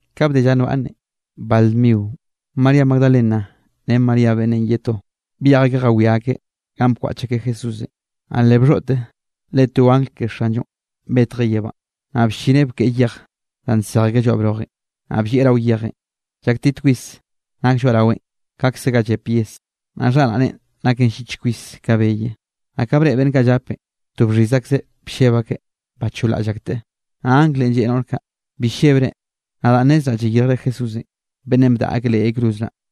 Ka bde lla nbaꞌnne, bal dmionꞌ María Magdalena ren María beꞌnnenꞌ ye to, byej akeꞌ jawiá akeꞌ ganꞌ bkwaꞌch akeꞌ Jesúsenꞌ. Naꞌ le bxhoꞌte, le to angl ke Xanllonꞌ betjeꞌ yebánꞌ, naꞌ bllineꞌ bkeꞌe yej danꞌ nsej lloaꞌ brojenꞌ, naꞌ bllieꞌ rao yejenꞌ. Llaktit kwis nake lloaꞌraweꞌn, kaꞌkze ga llep yes, naꞌ xharaꞌneꞌn naken llich kwis ka beye. Naꞌ ka breꞌe beꞌnn kaꞌ llapenꞌ, to bxhiz akzeꞌ blleb akeꞌ bacholraꞌll akteꞌ. Naꞌ anglenꞌ lleꞌe noꞌr kaꞌ: —Bi llebre, nadaꞌ nnezraꞌ llayirjre Jesúsenꞌ, beꞌnnenꞌ bdaꞌa akeꞌ leꞌ yay cruz naꞌ.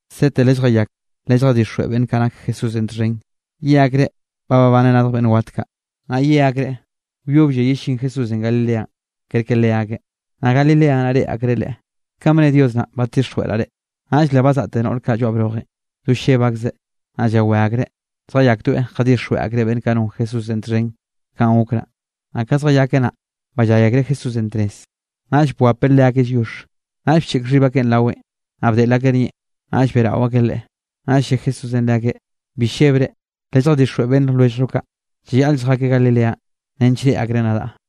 Sete lelljayak, lelljadixjweꞌ beꞌnn kaꞌ nak Jesúsenꞌ txhen, ye akreꞌ ba babaneꞌ radj beꞌnn wat kaꞌ. Naꞌ ye akreꞌ wyoblle yellín Jesúsenꞌ Galileanꞌ, kerke leakeꞌ, naꞌ Galilea naꞌ reꞌe akreꞌ Leꞌe. Kanꞌ bne Dios naꞌ badtixjweꞌraꞌ reꞌ. Naꞌll le bazaꞌte noꞌr kaꞌ lloaꞌ brojenꞌ, do lleb akzeꞌ naꞌ llawé akreꞌ, zjayakdoeꞌ jadixjweꞌ akreꞌ beꞌnn kaꞌ non Jesúsenꞌ txhen kanꞌ gok naꞌ. Naꞌ ka zjayakeꞌ naꞌ, ballay akreꞌ Jesúsenꞌ tnez. Naꞌll bwapeꞌ leakeꞌ lliox. Naꞌll bcheꞌk xhib akeꞌ raweꞌn, naꞌ bdeꞌl akeꞌ nieꞌn, naꞌll beꞌrao akeꞌ Leꞌe. Naꞌll lle Jesúsenꞌ leakeꞌ: —Bi llebre lelljadixjweꞌ beꞌnn lwelljllo kaꞌ, llayaꞌl lljakeꞌ Galileanꞌ nench reꞌe akreꞌ nadaꞌ.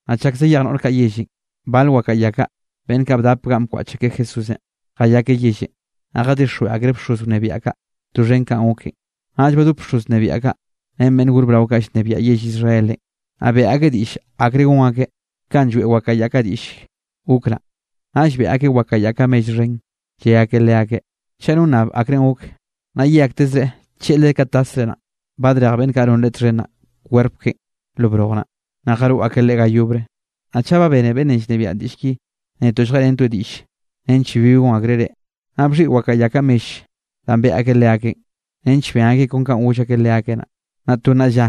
Naꞌ chak zjayak noꞌr kaꞌ yellenꞌ, bal wakaꞌa ya kaꞌ, beꞌnn kaꞌ bdap ganꞌ bkwaꞌch akeꞌ Jesúsenꞌ, jayakeꞌ yellenꞌ, naꞌ jadixjweꞌ akreꞌ bxoz wnebiaꞌ kaꞌ doxhen kanꞌ goken. Naꞌll badop bxoz wnebiaꞌ kaꞌ, ren beꞌnn gor brao kaꞌ llnebiaꞌ yell Israelenꞌ, naꞌ beꞌe akeꞌ diꞌll akre gon akeꞌ, kanꞌ lloeꞌ wakaꞌa ya kaꞌ diꞌll gok naꞌ. Naꞌll beꞌe akeꞌ wakaꞌa ya kaꞌ mell xhen. Lle akeꞌ leakeꞌ: —Chaꞌ no nnab akrenꞌ gok, naꞌ ye aktezreꞌ tlleꞌlre ka tasre naꞌ, badrej beꞌnn kaꞌ non leꞌe txhen naꞌ kwerp keꞌen lo broj naꞌ, naꞌ jaroꞌ akeꞌ Leꞌe ga yobre. Naꞌ chaꞌ ba bene beꞌnnenꞌ llnebiaꞌn diꞌll ki, netoꞌ lljeꞌrentoeꞌ diꞌll nench bibi gon akreꞌ reꞌ. Naꞌ bxhiꞌi wakaꞌa ya kaꞌ mell danꞌ beꞌe akeꞌ leakeꞌn, nench ben akeꞌ kon kanꞌ goll akeꞌ leakeꞌ naꞌ. Naꞌ to nnaꞌ lla,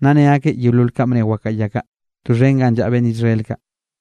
nna ne akeꞌ yeolol ka bne wakaꞌa ya kaꞌ, doxhen ganꞌ llaꞌa beꞌnn Israel kaꞌ.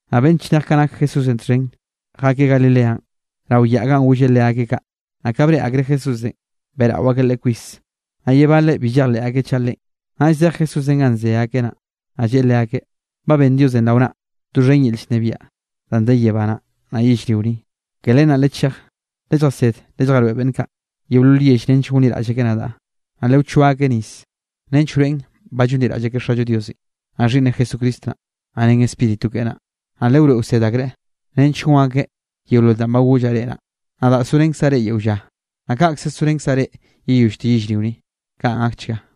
Naꞌ beꞌnn chnej kaꞌ nak Jesúsenꞌ txhen, jakeꞌ Galileanꞌ rao yaꞌ ganꞌ golleꞌ leakeꞌ kaꞌ. Naꞌ ka breꞌe akreꞌ Jesúsenꞌ, beꞌrao akeꞌ Leꞌe kwis. Naꞌ ye baleꞌ bi llejleꞌ akeꞌ chaꞌ Leꞌen. Naꞌll zej Jesúsenꞌ ganꞌ ze akeꞌ naꞌ, naꞌ lleꞌe leakeꞌ: —Ba ben Diosenꞌ rao naꞌ, doxhen yel llnebiaꞌ danꞌ de yebá naꞌ, naꞌ yellrio ni. Ke len naꞌ lechej, lelljased lelljaroeꞌ beꞌnn kaꞌ, yeolol yell nench gonliraꞌll akeꞌ nadaꞌ. Naꞌ lewchoa akeꞌ nis, nench wroeꞌn ba llonliraꞌll akeꞌ Xallo Diosenꞌ, naꞌ Xhiꞌnneꞌ Jesucristo naꞌ, naꞌ ren Spíritu keꞌe naꞌ. Naꞌ lewroeꞌ lewsed akreꞌ, nench gon akeꞌ yeolol danꞌ ba gollaꞌ reꞌ naꞌ. Nadaꞌ zorenkzaꞌ reꞌ yeo lla, naꞌ kaꞌkze sorenkzaꞌ reꞌ yeyollte yellrio ni. Kaꞌn gakchga.